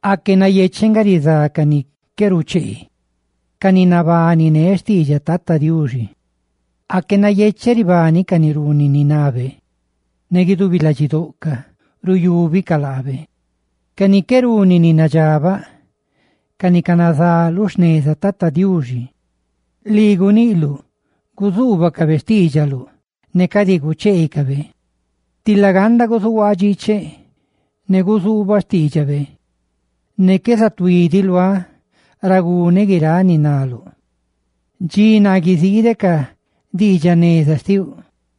Aque nayecheꞌ nga rizá ca ni qué rucheene ca ni nabaniné xtiidxaꞌ Tata Diuxi. Aque nayecheꞌ ribani ca ni runi ni nabe ne guidubi ladxidoꞌcaꞌ ruyúbicaꞌ laabe, ca ni qué runi ni nadxabaꞌ, ca ni canazá lu xneza Tata Diuxi. Lii guniꞌluꞌ guzuubacabe xtiidxaluꞌ ne cadi gucheecabe. ¡Tila ganda guzuhuaaꞌ dxiicheꞌ ne guzuubaꞌ diidxaꞌ biaꞌ xtiuꞌ! Ne qué zatuí diꞌ luáꞌ ra guneꞌ guiráꞌ ni naluꞌ. Zusisaca lii ne guidubi ladxiduáꞌ dxi naa guiziideꞌ ca diidxaꞌ jneza xtiuꞌ.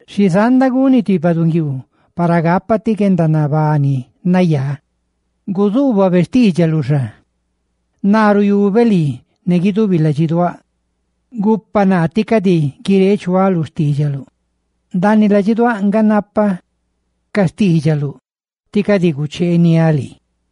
Xi zanda guni ti baꞌdunguiiu para gapa ti guendanabani nayá. ¡Guzuubabe xtiidxaluꞌ xa! Naa ruyubeꞌ lii ne guidubi ladxiduáꞌ; gupa naa tí cadi guireechuáꞌ lu xtiidxaluꞌ. Ndaaniꞌ ladxiduáꞌ nga napaꞌ ca xtiidxaluꞌ tí cadi gucheeniáꞌ lii.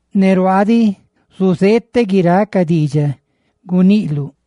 Ne ruaaꞌ diꞌ zuzeeteꞌ guiráꞌ ca diidxaꞌ guiniꞌluꞌ.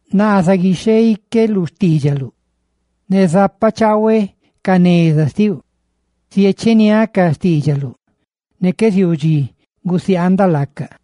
Naa zaguixheiqueꞌ lu xtiidxaluꞌ, ne zapachaahueꞌ ca neza xtiuꞌ. Ziecheniáꞌ ca diidxaꞌ biaꞌ xtiuꞌ ne qué ziuu dxi gusiaandaꞌ laacaꞌ.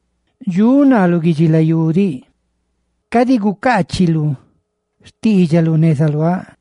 Dxuꞌ naa lu guidxilayú diꞌ; cadi gucaachiluꞌ xtiidxaluꞌ neza luáꞌ.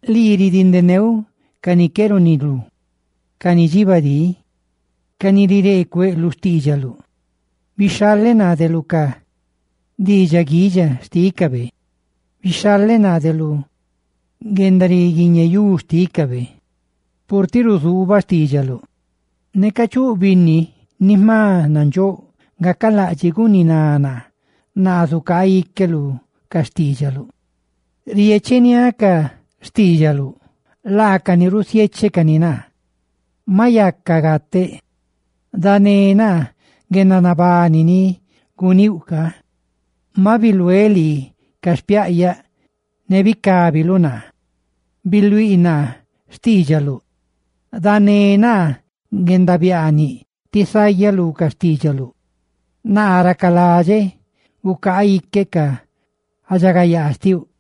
Lii ridindeneuꞌ ca ni qué runilú, ca ni dxibadí ca ni rireecueꞌ lu xtiidxaluꞌ. Bixhaleꞌ naa de lu ca diidxaꞌ guidxa xtícabe ne lu guendariguiñeyú xtícabe, purtiꞌ ruzuubaꞌ xtiidxaluꞌ. Neca chuꞌ binni ni jma nandxóꞌ gacalaꞌdxiꞌ guniná naa, naa zucaaꞌ iqueꞌ lu ca xtiidxaluꞌ. Riecheniáꞌ ca xtiidxaluꞌ; laacani rusiénecani naa. Maꞌ yaca gateꞌ; ¡dané naa, guendanabani casi guníuꞌ ca! Maꞌ biluéꞌ lii ca xpiaꞌyaꞌ, ne bicábiluꞌ naa. ¡Bisiidiꞌ naa ca diidxaꞌ biaꞌ xtiuꞌ! Dané naa guendabiaaniꞌ ti sayaꞌ lu ca xtiidxaluꞌ, naa racaladxeꞌ gucaaꞌ iqueꞌ ca guendaridxagayaa xtiuꞌ.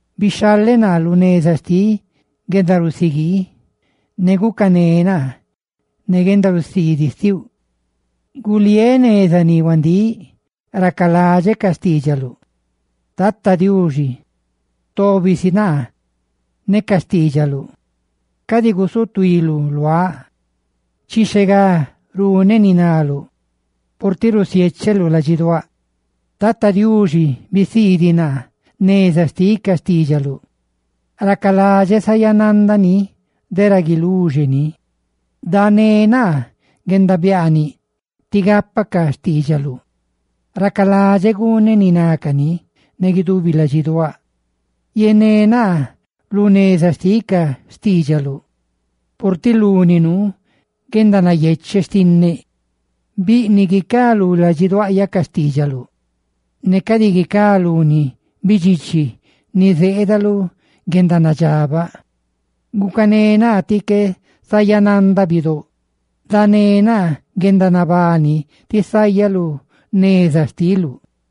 Bixhaleꞌ naa lu neza xtiꞌ guendarusiguii, ne gucané naa ne guendarusiidiꞌ xtiuꞌ. Guliéꞌ neza ni huandíꞌ, ne racaladxeꞌ ca xtiidxaluꞌ. Tata Diuxi, tobi si naa ne ca xtiidxaluꞌ; ¡cadi gusutuiluꞌ luáꞌ! Chixhe gá runeꞌ ni naluꞌ purtiꞌ risiécheluꞌ ladxiduáꞌ. Tata Diuxi, bisiidiꞌ naa neza xtiꞌ ca diidxaꞌ biaꞌ xtiuꞌ, tí racaladxeꞌ sayanandaꞌ ni de ra guiluxe ni. Dané naa guendabiaaniꞌ tí gapaꞌ xtiidxaluꞌ; ¡racaladxeꞌ guneꞌ ni nani ne guidubi ladxiduáꞌ! Yené naa lu neza xtiꞌ ca xtiidxaluꞌ, purtiꞌ luni nuu guendanayecheꞌ xtinneꞌ. Biꞌniꞌ guicá lú ladxiduaꞌyaꞌ ca xtiidxaluꞌ ne cadi guicá luni bidxichi ni zeeda lu guendanadxabaꞌ. Gucané naa tí cadi sayanandaꞌ ca bidóꞌ ni cadi dxandíꞌ; ¡dané naa guendanabani ti sayaꞌ lu neza xtiluꞌ!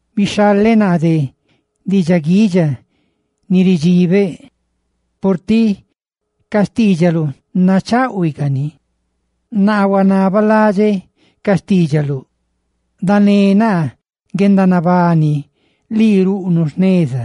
Bixhaleꞌ naa de diidxaꞌ guidxa ni ridxibeꞌ, purtiꞌ ca xtiidxaluꞌ nacháꞌhuicani. Naa huanabalaꞌdxeꞌ ca xtiidxaluꞌ; ¡dané naa guendanabani, lii ruꞌnuꞌ jneza!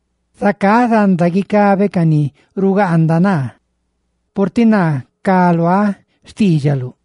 Zacá zanda guicabeꞌ ca ni rugaanda naa, purtiꞌ naa ca luáꞌ xtiidxaluꞌ.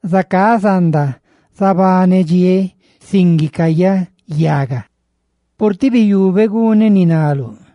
Zacá zanda zabanedxiéꞌ sin guicayaꞌ yaga, purtiꞌ biyubeꞌ guneꞌ ni naluꞌ.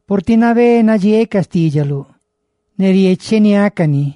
Purtiꞌ nabé nadxieeꞌ ca xtiidxaluꞌ ne riecheniáꞌ cani.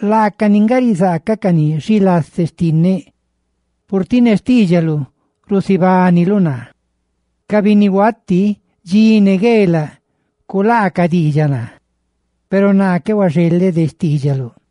Laani nga rizácani naa, lu xilase xtinneꞌ: purtiꞌ ne xtiidxaluꞌ rusibániluꞌ naa. Ca binnihuati dxi ne gueelaꞌ culaacaꞌ diidxaꞌ naa, peru naa qué huaxeleꞌ de xtiidxaluꞌ.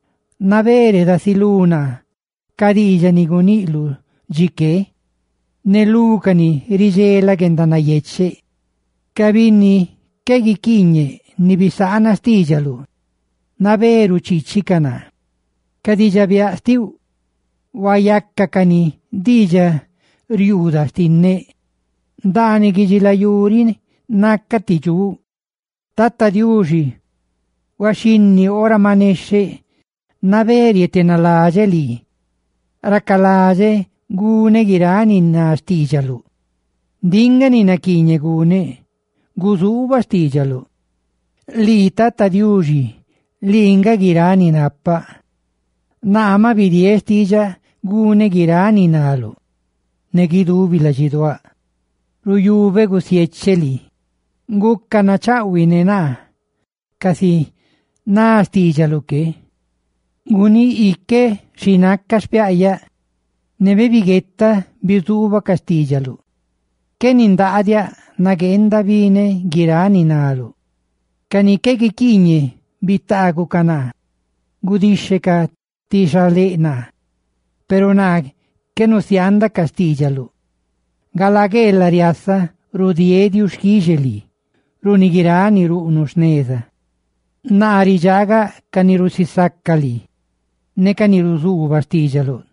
Nabé redasilú naa ca diidxaꞌ ni guniꞌluꞌ chiqué, ne lúcani, Tata Diuxi, ridxelaꞌ guendanayecheꞌ. Ca binni qué guiquiiñeꞌ ni bisaana xtiidxaluꞌ nabé ruchiichicaꞌ naa. Ca diidxaꞌ biaꞌ xtiuꞌ huayácacani diidxariuundaꞌ xtinneꞌ ndaaniꞌ guidxilayú riꞌ ra nacaꞌ ti dxuꞌ. Tata Diuxi, huaxhinni ora ma nexheꞌ nabé rietenaladxeꞌ lii; ¡racaladxeꞌ guneꞌ guiráꞌ ni ná xtiidxaluꞌ! Ndiꞌ nga ni naquiiñeꞌ guneꞌ: guzuubaꞌ xtiidxaluꞌ. Lii, Tata Diuxi, lii nga guiráꞌ ni napaꞌ; naa maꞌ bidieeꞌ xtiidxaꞌ guneꞌ guiráꞌ ni naluꞌ. Ne guidubi ladxiduáꞌ ruyubeꞌ gusiecheꞌ lii; guca nachaꞌhuiꞌ ne naa, casi ná xtiidxaluꞌ que. Guníꞌ iqueꞌ xi ná ca xpiaꞌyaꞌ, ne bibiguetaꞌ bizuubaꞌ ca xtiidxaluꞌ. Qué nindaadiaꞌ, nagueenda bineꞌ guiráꞌ ni naluꞌ. Ca ni qué guiquiiñe bitaagucaꞌ naa, gudixhecaꞌ ti xaléꞌ naa, peru naa qué nusiaandaꞌ ca xtiidxaluꞌ. Galaa gueelaꞌ riasaꞌ rudieeꞌ diuxquixe lii runi guiráꞌ ni ruꞌnuꞌ jneza. Naa ridxaagaꞌ ca ni rusisaca lii ne ca ni ruzuubaꞌ xtiidxaluꞌ.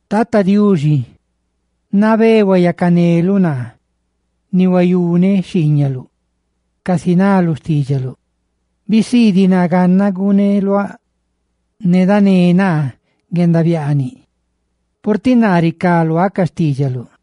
Tata Diuxi, nabé huyacaneluꞌ naa ni huayuneꞌ xhiiñaluꞌ, casi ná lu xtiidxaluꞌ. Bisiidiꞌ naa gannaꞌ guneluáꞌ ne dané naa guendabiaaniꞌ, purtiꞌ naa ricá luáꞌ ca xtiidxaluꞌ.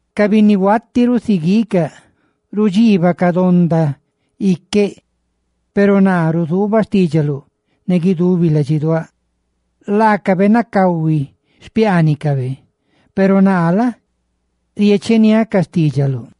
Ca binnihuati rusiguiicaꞌ rudxiibacaꞌ donda iqueꞌ, peru naa ruzuubaꞌ xtiidxaluꞌ ne guidubi ladxiduáꞌ. Laacabe nacahui xpiaanicabe, peru naa la? riecheniáꞌ ca xtiidxaluꞌ.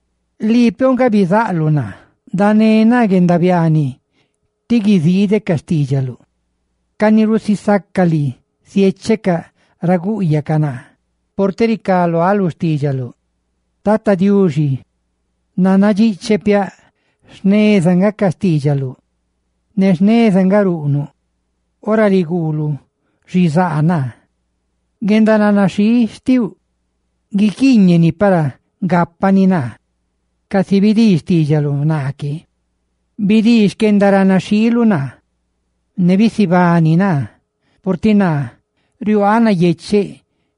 Lii piouꞌ nga bizaꞌluꞌ ne bisiiduꞌ naa; ¡dané naa guendabiaaniꞌ ti guiziideꞌ ca xtiidxaluꞌ! Ca ni rusisaca lii ziéchecaꞌ ra gúꞌyacaꞌ naa, purtiꞌ ricá luáꞌ lu xtiidxaluꞌ. Tata Diuxi, nannadxicheꞌ piaꞌ jneza nga ca xtiidxaluꞌ ne jneza nga ruꞌnuꞌ ora riguuluꞌ xizaa naa. ¡Guendaranaxhii xtiuꞌ guiquiiñeni para gápani naa, casi bidii xtiidxaluꞌ naa que! Bidii xquendaranaxhiiluꞌ naa, ne bisibani naa, purtiꞌ naa riuaaꞌ nayecheꞌ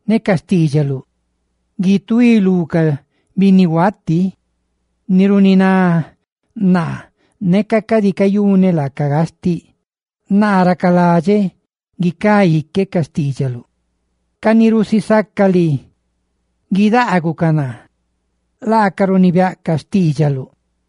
ne ca xtiidxaluꞌ. Guituí lú ca binnihuati ni runiná naa neca cadi cayuneꞌ laacaꞌ gastiꞌ; naa racaladxeꞌ guicá iqueꞌ ca xtiidxaluꞌ. Ca ni rusisaca lii ca guidaagucaꞌ naa, laacaꞌ runibiaꞌcaꞌ xtiidxaluꞌ.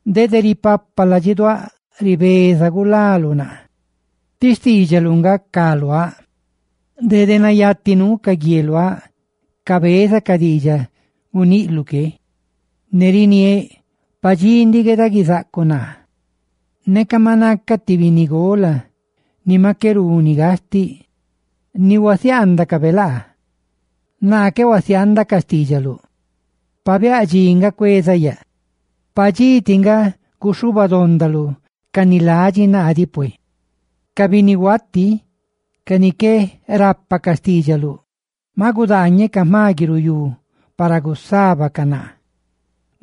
Dede ripapa ladxiduáꞌ ribezaꞌ gulaluꞌ naa; ¡ti xtiidxaluꞌ nga ca luáꞌ! Dede nayati nuu ca guieluáꞌ cabezaꞌ ca diidxaꞌ guniꞌluꞌ que, ne riniéꞌ: «Padxí ndiꞌ gueeda guizacaluꞌ naa.» Neca maꞌ nacaꞌ ti binnigola ni maꞌ qué runi gastiꞌ, ni huasiaandacabe laa, naa qué huasiaandaꞌ ca diidxaꞌ biaꞌ xtiuꞌ. Pabiáꞌ dxi tiꞌ ndiꞌ cuezaꞌ yaꞌ. Padxí tiꞌ nga guxhuubadondaluꞌ ca ni ladxi naa diꞌ pue. Ca binnihuati ca ni qué rapa ca xtiidxaluꞌ maꞌ gudaañecaꞌ jma guiruyú para gusábacaꞌ naa.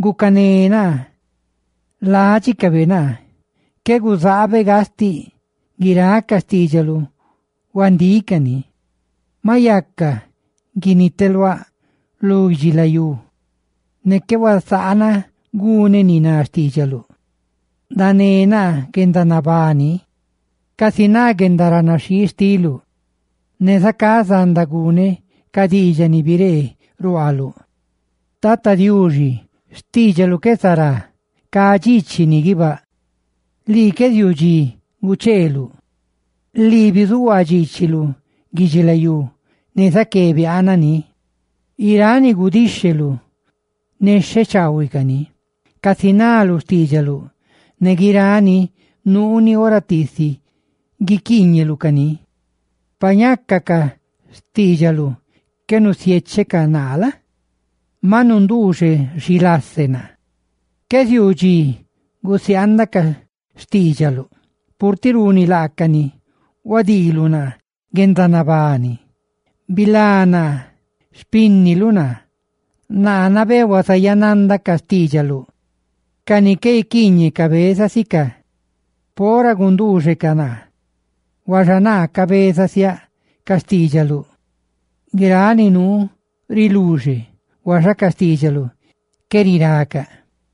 ¡Gucané naa, ládxicabe naa qué guzaabeꞌ gastiꞌ! ¡Guiráꞌ ca xtiidxaluꞌ huandíꞌ cani! Maꞌ yaca guiniteluáꞌ lu guidxilayú, ne qué huasaanaꞌ guneꞌ ni ná xtiidxaluꞌ. Dané naa guendanabani casi ná guendaranaxhii xtiluꞌ, ne zacá zanda guneꞌ ca diidxaꞌ ni biree ruaaluꞌ. Tata Diuxi, xtiidxaluꞌ qué zará; ¡cá dxiichiꞌ ni guibáꞌ! Lii qué ziuu dxi gucheeluꞌ; lii bizuhuaa dxiichiluꞌ guidxilayú, ne zaqué biaana ni. Guiráꞌ ni gudíxheluꞌ nexhe chaahuiꞌ cani, casi ná lu xtiidxaluꞌ, ne guirani nuuni ora tiisi guiquiiñeluꞌ cani. Pa ñaca ca xtiidxaluꞌ qué nusiéchecaꞌ naa la? maꞌ nunduuxeꞌ xilase naa. Qué ziuu dxi gusiaandaꞌ ca xtiidxaluꞌ, purtiꞌ runi laacani huadiiluꞌ naa guendanabani. ¡Bilá naa, xpínniluꞌ naa, ne nabé huazayanandaꞌ ca xtiidxaluꞌ! Ca ni qué guiquiiñeꞌ cabeza sicaꞌ pora gunduuxecaꞌ naa, huaxa naa cabeza siaꞌ ca xtiidxaluꞌ. Huayuuyaꞌ guiráꞌ xixé ni nuu riluxe, huaxa ca xtiidxaluꞌ qué riracaꞌ.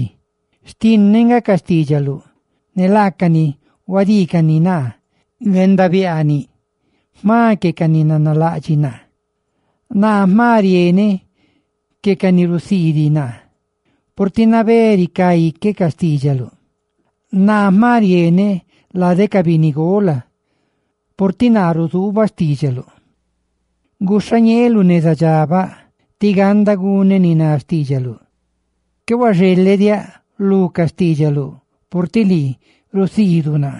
Dxi gueelaꞌ xtinneꞌ nga ca xtiidxaluꞌ; ne laacani huadiicani naa guendabiaaniꞌ jma que ca ni nanalaꞌdxiꞌ naa. Naa jma rieneꞌ que ca ni rusiidiꞌ naa purtiꞌ nabé ricá iqueꞌ ca xtiidxaluꞌ. Naa jma rieneꞌ lade ca binnigola purtiꞌ naa ruzuubaꞌ xtiidxaluꞌ. Guxhañeeꞌ lu neza dxabaꞌ tí ganda guneꞌ ni ná xtiidxaluꞌ. Qué huaxelediáꞌ lu ca xtiidxaluꞌ purtiꞌ lii nga rusiidiluꞌ naa.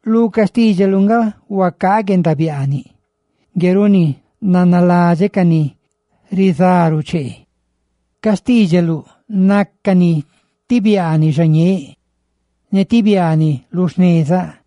Lu ca xtiidxaluꞌ nga huacaaꞌ guendabiaaniꞌ; ngue runi nanaladxeꞌ ca ni rizá ruchee. Ca xtiidxaluꞌ nácani ti biaaniꞌ xañeeꞌ ne ti biaaniꞌ lu xnezaꞌ.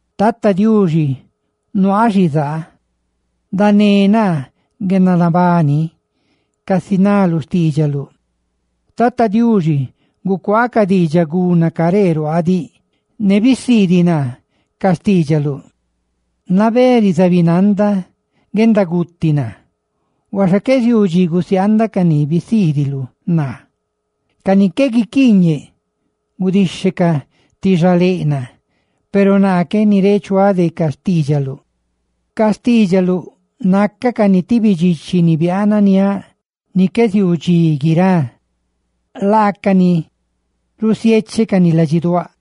Tata Diuxi, nabé nuaaꞌ xizaa; ¡dané naa guendanabani, casi ná lu xtiidxaluꞌ! Tata Diuxi, gucuaa ca diidxaꞌ guna caree ruaaꞌ diꞌ, ne bisiidiꞌ naa ca xtiidxaluꞌ. Nabé rizabinanda guendaguti naa, huaxa qué ziuu dxi gusiaandaꞌ ca ni bisiidiluꞌ naa. Ca ni qué guiquiiñe gudixhecaꞌ ti xaléꞌ naa, peru naa qué nireechuáꞌ de ca xtiidxaluꞌ. Ca xtiidxaluꞌ nácacani ti bidxichi ni biaananiáꞌ ni qué ziuu diꞌ dxi guirá, purtiꞌ laacani risiéchecani ladxiduáꞌ.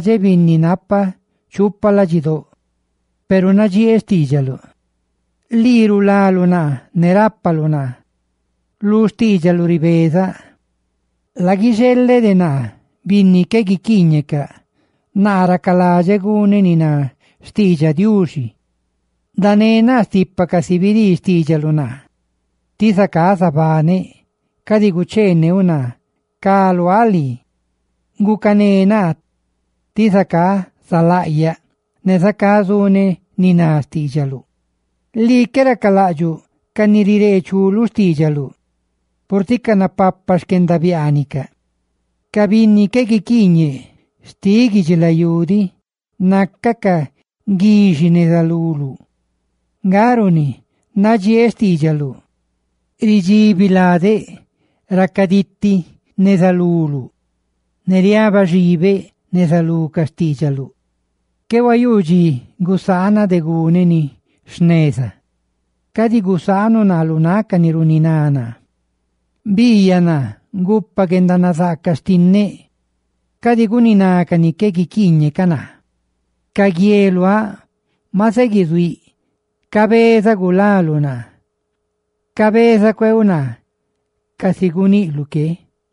Nanaladxeꞌ binni napa chupa ladxidóꞌ, peru nadxieeꞌ xtiidxaluꞌ. Lii rulaluꞌ naa ne rápaluꞌ naa; lu xtiidxaluꞌ ricayaꞌ luaꞌ. ¡Laguixeleꞌ de naa, binni qué guiquiiñecaꞌ, tí racaladxeꞌ guneꞌ ni ná xtiidxaꞌ Diuxi! Dané naa stipa, casi bidii xtiidxaluꞌ naa, ti zacá zabaneꞌ; ¡cadi gucheeneuꞌ naa, ca luáꞌ lii! Gucané naa, ti zacá zalaꞌyaꞌ; ne zacá zuneꞌ ni ná ca diidxaꞌ biaꞌ xtiuꞌ. Lii qué racalaꞌdxuꞌ ca ni rireechú lu diidxaꞌ biaꞌ xtiuꞌ, purtiꞌ canapapa xquendabiaanicaꞌ. Ca binni qué guiquiiñe xtiꞌ guidxilayú diꞌ nácacaꞌ guixi neza luluꞌ; nga runi nadxieeꞌ xtiidxaluꞌ. Ridxibi ladeꞌ, racaditi neza luluꞌ; ¡ne rusabaꞌ iqueꞌ neza lú ca xtiidxaluꞌ! Qué huayuu dxi gusaanaꞌ de guneꞌ ni jneza; cadi gusaanuꞌ naa lu náꞌ ca ni runiná naa. Biiyaꞌ naa, gupa guendanazaaca xtinneꞌ; cadi guniná ca ni qué guiquiiñe ca naa. Ca guieluáꞌ maꞌ zeguizuíꞌ cabeza gulaluꞌ naa, cabezaꞌ gulaluꞌ naa, casi guniꞌluꞌ que.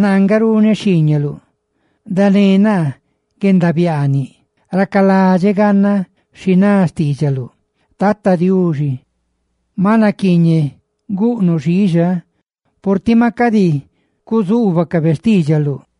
Naa nga runeꞌ xhiiñaluꞌ. Dané naa guendabiaaniꞌ, racaladxeꞌ gannaꞌ xi ná xtiidxaluꞌ. Tata Diuxi, maꞌ naquiiñeꞌ guꞌnuꞌ xiixa, purtiꞌ maꞌ cadi cuzuubacabe xtiidxaluꞌ.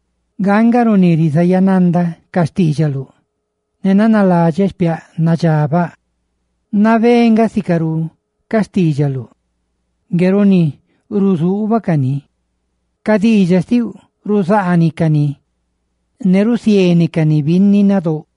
Nga nga runi rizayanandaꞌ ca xtiidxaluꞌ ne nanaladxeꞌ xpiaꞌ ni nadxabaꞌ. Nabé nga sicarú ca xtiidxaluꞌ; ngue runi ruzuubaꞌ cani. Ca diidxaꞌ ni rusiéneluꞌ, ruzaaniꞌ cani, ne rusiénecani binni nadóꞌ.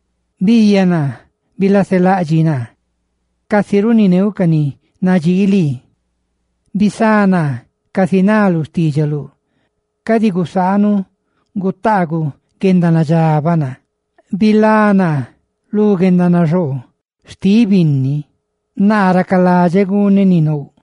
Biiyaꞌ naa, ne bilaselaꞌdxiꞌ naa, casi runineuꞌ ca ni nadxii lii. Bisá naa casi ná lu xtiidxaluꞌ; cadi gusaanuꞌ gutaaguꞌ guendanadxabaꞌ naa. Bilá naa lu guendanaxoo xtiꞌ binni, naa racaladxeꞌ guneꞌ ni nouꞌ.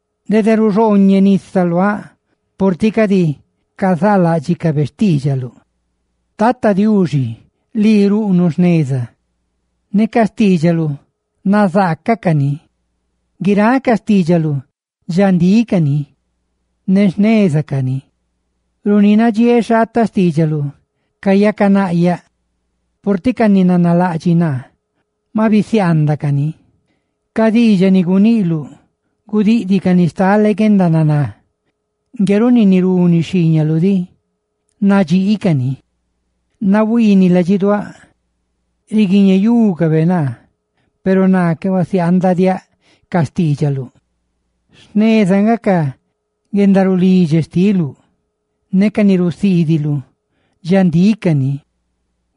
Dede ruxooñeꞌ nisa luáꞌ purtiꞌ cadi cazaaláꞌdxicabe xtiidxaluꞌ. Tata Diuxi, lii ruꞌnuꞌ jneza; ne ca xtiidxaluꞌ nazaaca cani. Guiráꞌ ca xtiidxaluꞌ dxandíꞌ cani ne jneza cani. Runi nadxieeꞌ xhaataꞌ xtiidxaluꞌ cayacanaꞌyaꞌ, purtiꞌ ca ni nanalaꞌdxiꞌ naa maꞌ bisiaandaꞌ cani. Ca diidxaꞌ ni guniꞌluꞌ gudiꞌdicani stale guendananá; ngue runi, ni runi xhiiñaluꞌdiꞌ nadxiicani. Nahuiiniꞌ ladxiduáꞌ, riguiñeyúcabe naa, peru naa qué huasiaandaꞌ diaꞌ ca xtiidxaluꞌ. Jneza nga ca guendarulidxe xtiluꞌ, ne ca ni rusiidiluꞌ dxandíꞌ cani.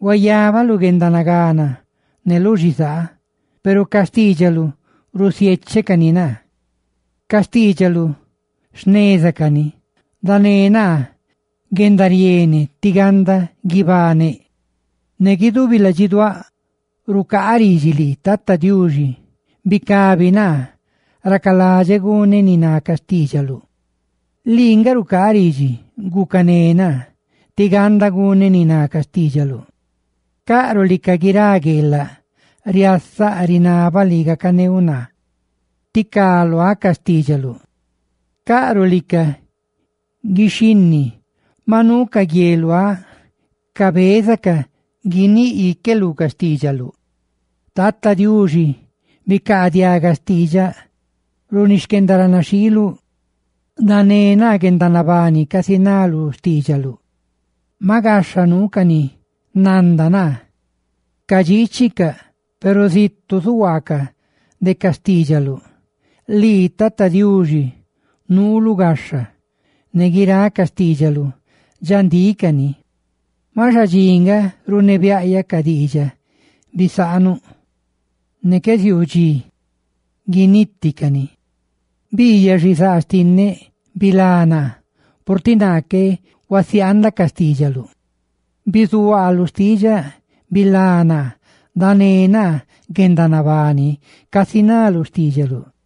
Huayabaꞌ lu guendanagana ne lu xizaa, peru ca xtiidxaluꞌ bisiéchecani naa. Ca xtiidxaluꞌ jneza cani; ¡dané naa guendariene tí ganda guibaneꞌ! Ne guidubi ladxiduáꞌ rucaaꞌ ridxi lii, Tata Diuxi; ¡bicabi naa, racaladxeꞌ guneꞌ ni ná ca diidxaꞌ biaꞌ xtiuꞌ! Lii nga rucaaꞌ ridxi, gucané naa tí ganda guneꞌ ni ná ca xtiidxaluꞌ. Caꞌruꞌ lica guirá gueelaꞌ, riasaꞌ rinabaꞌ lii gacaneuꞌ naa; ti ca luáꞌ ca xtiidxaluꞌ. Caꞌruꞌ lica guixhinni, maꞌ nuu ca guieluáꞌ cabezacaꞌ guiníꞌ iqueꞌ lu ca xtiidxaluꞌ. Tata Diuxi, bicaadiaga xtiidxaꞌ, runi xquendaranaxhiiluꞌ; dané naa guendanabani, casi ná lu xtiidxaluꞌ. Maꞌ gaxha nuu ca ni nanda naa cadxiichicaꞌ, peru zitu zuhuaacaꞌ de ca xtiidxaluꞌ. Lii, Tata Diuxi, nuuluꞌ gaxha, ne guiráꞌ ca xtiidxaluꞌ dxandíꞌ cani. Maꞌ xadxi nga runebiaꞌyaꞌ ca diidxaꞌ bisaanuꞌ, ne qué ziuu dxi guiniti cani. Biiyaꞌ xizaa xtinneꞌ, bilá naa, purtiꞌ naa qué huasiaandaꞌ ca xtiidxaluꞌ. Bizuhuaa lu xtiidxaꞌ ne bilá naa; ¡dané naa guendanabani, casi ná lu xtiidxaluꞌ!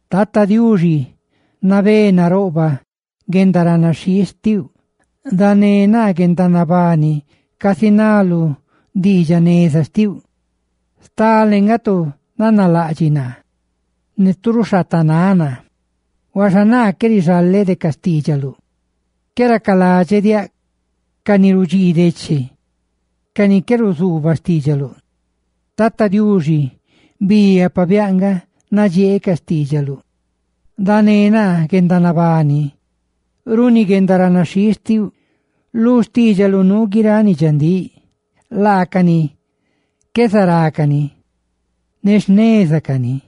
Tata Diuxi, nabé naroꞌbaꞌ guendaranaxhii xtiuꞌ; ¡dané naa guendanabani, casi ná lu diidxaꞌ jneza xtiuꞌ! Stale nga tu nanalaꞌdxiꞌ naa ne tu ruxhaatanáꞌ naa, huaxa naa qué rixaleꞌ de ca xtiidxaluꞌ. Qué racaladxeꞌ diaꞌ ca ni rudxii deche, ca ni qué ruzuubaꞌ xtiidxaluꞌ. Tata Diuxi, biiyaꞌ pabiáꞌ nga nadxieeꞌ ca xtiidxaluꞌ; ¡dané naa guendanabani, runi guendaranaxhii xtiuꞌ! Lu xtiidxaluꞌ nuu guiráꞌ ni dxandíꞌ; laacani qué zará cani ne jneza cani.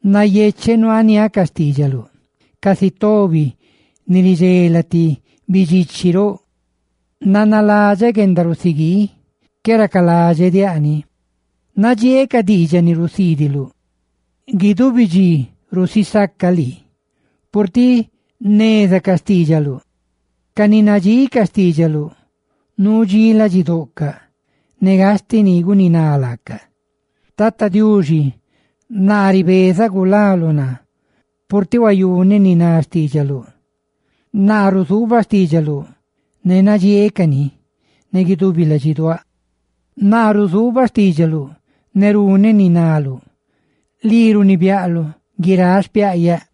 Nayecheꞌ nuaaniáꞌ ca xtiidxaluꞌ, casi tobi ni ridxela ti bidxichi roꞌ. Nanaladxeꞌ guendarusiguii, qué racaladxeꞌ diaꞌ ni; huaxa nadxieeꞌ ca diidxaꞌ ni rusiidiluꞌ. Guidubi dxi rusisacaꞌ lii purtiꞌ jneza ca xtiidxaluꞌ. Ca ni nadxii ca xtiidxaluꞌ nuu dxí ladxidoꞌcaꞌ, ne gastiꞌ ni gusaba laacaꞌ. Tata Diuxi, naa ribezaꞌ gulaluꞌ naa, purtiꞌ huayuneꞌ ni ná xtiidxaluꞌ. Naa ruzuubaꞌ xtiidxaluꞌ ne nadxieeꞌ cani ne guidubi ladxiduáꞌ. Naa ruzuubaꞌ xtiidxaluꞌ ne runeꞌ ni naluꞌ; ¡lii runibiaꞌluꞌ guiráꞌ xpiaꞌyaꞌ!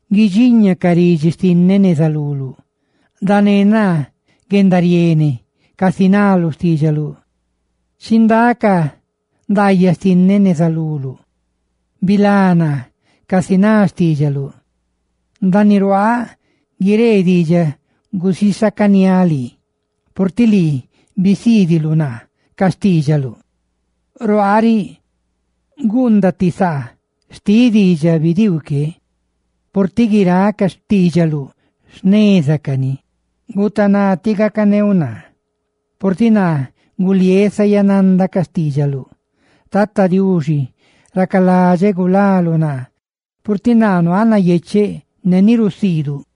Guidxiña ca ridxi xtinneꞌ neza luluꞌ, Tata Diuxi; ¡dané naa guendariene, casi ná lu xtiidxaluꞌ! Chindá ca ndaayaꞌ xtinneꞌ neza luluꞌ; ¡bilá naa, casi ná xtiidxaluꞌ! Ndaaniꞌ ruaaꞌ guieleꞌ diidxaꞌ gusisacaniáꞌ lii, purtiꞌ lii bisiidiluꞌ naa ca diidxaꞌ biaꞌ xtiuꞌ. Ruaaꞌ riꞌ guundaꞌ ti saa xtiꞌ diidxaꞌ bidiiu que, purtiꞌ guiráꞌ ca xtiidxaluꞌ jneza cani. Nuuca nuuca naluꞌ gacané naa, purtiꞌ naa guliéꞌ zaya nandaꞌ ca xtiidxaluꞌ. Tata Diuxi, ¡racaladxeꞌ gulaluꞌ naa! ¡Purtiꞌ naa nuaaꞌ nayecheꞌ ne ni rusiiduꞌ!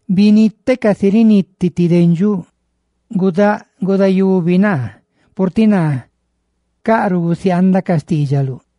Biniteꞌ casi riniti ti dendxuꞌ; ¡gudáꞌ gudayubi naa, purtiꞌ naa caꞌruꞌ gusiaandaꞌ ca xtiidxaluꞌ!